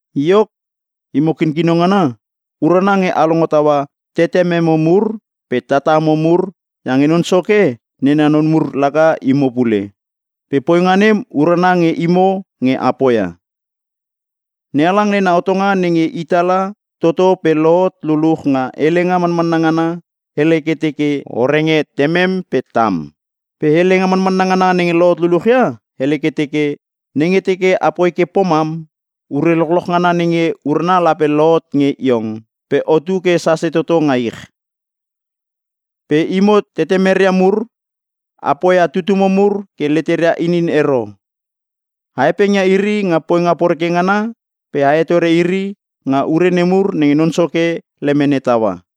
Iok, imo kinkino ngana urana nge a longo taua tetememo mur pe tatamo mur iange Non Soke nena non mur laka imo pule, pe poinga nem urana nge imo nge a poia. NeHalang nena hotonga nenge i tala toto pe lohot luluch nga helenga manmanna ngana, hele ke teke, “O renge temem pe tam.” Pe helenga manmanna ngana nenge lohot luluch ia hele ke teke, “Nenge teke apoi ke pomam, ure lochloch ngana nenge urana lape te lohot nge iong pe otu ke sase toto nga ich.” Pe imo tetemeria mur, a poia tutumo mur ke leteria inin ero. A hepengia iri nga poinga poreke ngana pe a hetore iri nga ure nemur nenge Non Soke lemene taua.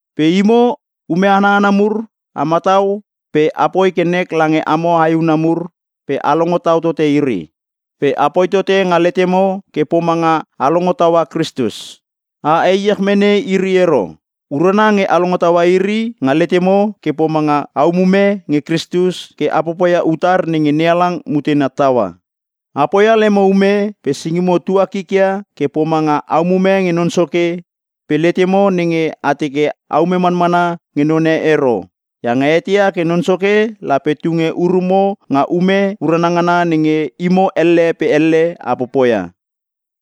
Pe imo ume ana hana mur a matau pe apoi ke nek lange amo aehuna mur pe a longo tau tote iri. Pe apoi tote nga letemo ke pomanga a longo taua Kristus. A heiech mene iri ero. Urana nge a longo taua iri nga letemo ke pomanga a umume nge Kristus ke a popoia utar nenge NeHalang mutena taua. A poia lemo ume pe singimo tua kikia ke pomanga a umume nge Non Soke pe letemo nenge a teke aume manmana nge none ero iange a eteia ke Non Soke lape tunge urumo nga ume urana ngana nenge imo elle pe elle a popoia.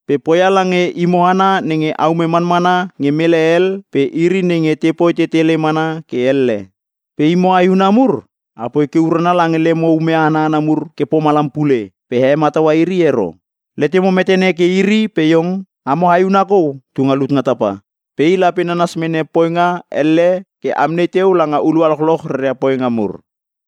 Pe poia lange imo hana nenge aume manmana nge mele hel pe iri nenge te poi tetele mana ke elle. Pe imo aehuna mur, apoi ke urana lange lemo ume ana hana mur ke pomalam pule pe a hemataua iri ero. Letemo metene ke iri pe iong, amo Aehuna kou tu nga lut nga tapa. Pe i lape nanas mene poinga elle ke amnei teu langa hulua lochloch reria poinga mur.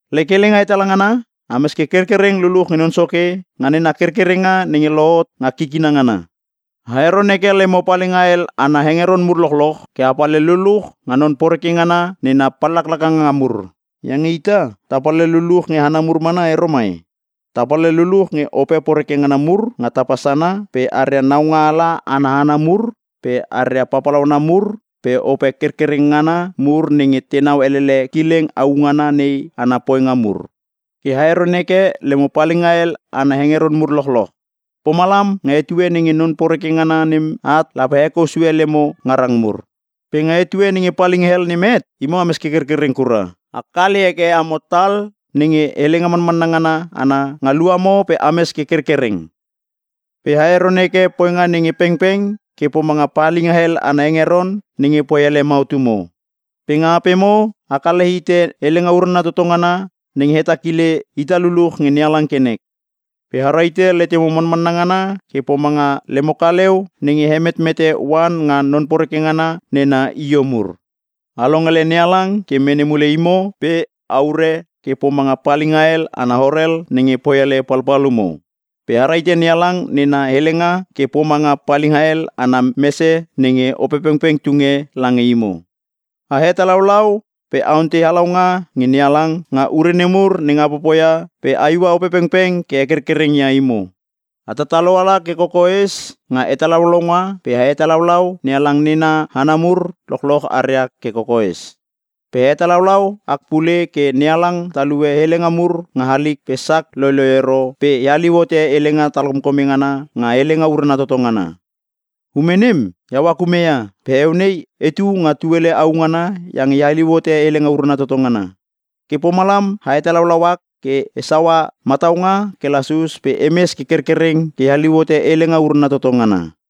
Lek helenga hetala ngana, ames ke kerkereng luluch nge Non Soke nga nena kerkerenga nenge lohot nga kikina ngana. A heron heke lemo palinga hel ana hengeron mur lochloch ke a palhel luluch nga non poreke ngana nena pallaklakanga mur. Iange ita, ta palhel luluch nge hana mur mana ero mai. Ta palhel luluch nge ope poreke ngana mur nga tapa sana pe aria naungaala ana hana mur pe aria papalauana mur pe ope kerkereng ngana mur nenge tenau elele kileng au ngana nei ana poinga mur. Ke a heron heke lemo palinga hel ana hengeron mur lochloch. Pomalam nga etue nenge non poreke ngana nem at lape a hekou sue lemo ngarang mur. Pe nga etue nenge palinga hel nem het, imo ames ke kerkereng kura. A kale heke amo tal nenge helenga manmanna ngana ana nga luamo pe ames ke kerkereng. Pe a heron heke poinga nge pengpeng ke pomanga palinga hel ana hengeron nenge poi hele mautumo. Pe nga apemo a kale hite helenga urana toto ngana nenge hetakile ita luluch nge NeHalang ke nek. Pe a rahite letemo manmanna ngana ke pomanga lemo kaleu nenge he metmete oan nga non poreke ngana nena io mur. A longele NeHalang ke mene mule imo pe a ure ke pomanga palinga hel ana horel nenge poi hele palpalumo. Pe a rahite NeHalang nena helenga ke pomanga palinga hel ana mese nenge Opepengpeng tunge lange imo. A hetalaulau pe a ontei halaunga nge NeHalang nga ure nemur nenge a popoia pe a iua Opepengpeng ke hekerkereng ia imo. A tatalo ala ke kokoes nga hetalaulaunga pe a hetalaulau NeHalang nena hana mur lochloch aria ke kokoes. Pe a hetalaulau ak pule ke NeHalang talue helenga mur nga halik pe sak loiloi ero pe e haliu hote helenga talkomkome ngana nga helenga urana toto ngana. Ume nem iau ak ume ia pe heueu nei etu nga tuele au ngana iange e haliu hote helenga urana toto ngana. Ke pomalam a hetalaulau ak ke e saua mataunga ke lasus pe emes ke kerkereng ke e haliu hote helenga urana toto ngana.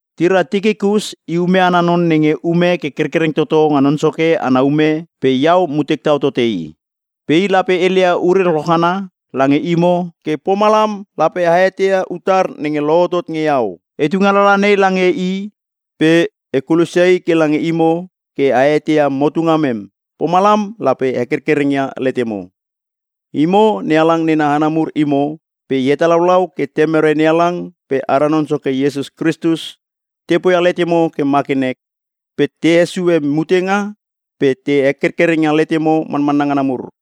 Tira Tikikus i ume ana non nenge ume ke kerkereng toto nga Non Soke ana ume pe iau mutek tau tote i. Pe i lape heleia ure lochloch ngana lange imo ke pomalam lape a eteia utar nenge lohotot nge iau. E tunge alalaha nei lange i pe e kulosia i ke lange imo ke a eteia motu ngamem, pomalam lape hekerkereng ia letemo. Imo NeHalang nena hana mur imo pe e hetalaulau ke Temere NeHalang pe ara Non Soke Iesus Kristus te poia letemo ke ma ke nek, pe te hesue mutenga pe te hekerkereng ia letemo manmanna ngana mur.